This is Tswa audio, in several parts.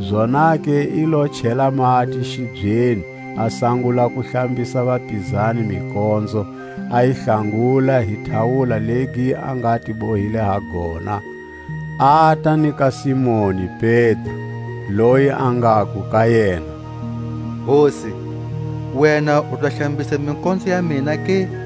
Zonake i lo chela mati xibyeni, a sangula ku hlambisa vapizani mikonzo, a yi hlanguta hi tawula legi a nga ti bohile ha gona. Ata ni ka Simoni Pedro, loyi a ngaku ka yena: Hosi, wena u ta hlambisa mikonzo ya mina ke?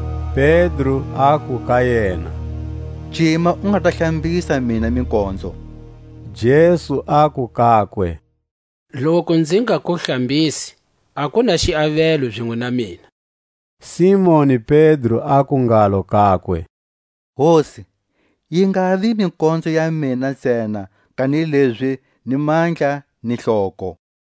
Pedro aku ka yena: Cima u nga ta hlambisa mina mikonzo. Jesu aku kakwe: Loku nzi nga ku hlambisi, a ku na xiavelo zinwe na mina. Simoni Pedro aku ngalo kakwe: Hosi, yi ngavi mikonzo ya mina ntsena, kanilezi ni mandla ni hloko.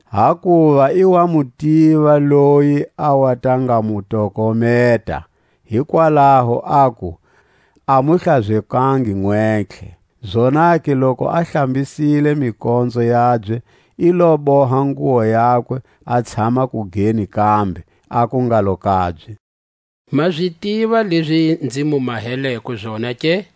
Hakuva i wa mu tiva loyi a wa ta nga mu tokometa, hikwalaho aku: A mu hlazekangi nwentlhe. Zonake loku a hlambisile mikonzo yabye, i lo boha nguwo yakwe, a tshama kugeni kambe, aku ngalo kabye: Ma zi tiva lezi nzi mu maheleko zona ke?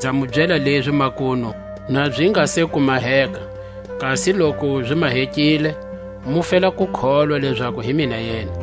Nza mu byela lezi makunu, na zi nga se ku maheka, kasi loku zi mahekile, mu fela ku kholwa lezaku hi mina yena.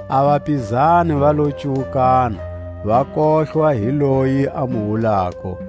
A vapizani va lo cuwukana, va kohlwa hi loyi a mu wulako.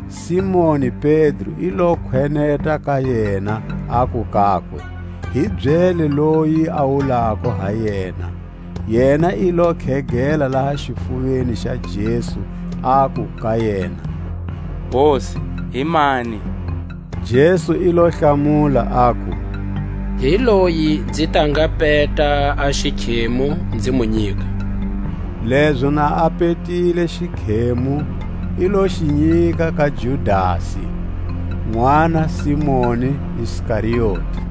Simoni Pedro i lo kweneta ka yena, aku kakwe: Hi byele loyi a wulako ha yena. Yena i lo khegela laha xifuveni xa Jesu, aku ka yena: Hosi, himani? Jesu i lo hlamula, aku: Hi loyi nzi ta nga peta a xikhemu, nzi mu nyika. Lezo na a petile xikhemu, i lo xi nyika ka Judasi, nʼwana Simoni Iskarioti.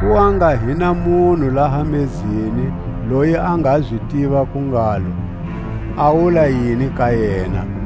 Ku wa nga hi na munhu laha mezeni loyi a nga zi tiva ku ngalo, a wula yini ka yena.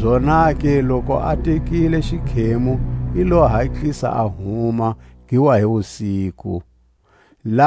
Zonake loku a tekile xikhemu i lo hatlisa a huma; gi wa hi wusiku. A nayo muswa.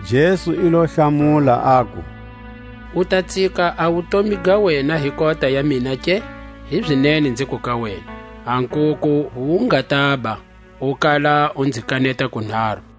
Jesu i lo hlamula, aku: U ta tsika a wutomi ga wena hi kota ya mina ke? Hizinene nziku ka wena: A nkuku wu nga taba, u kala u nzi kaneta kunharu.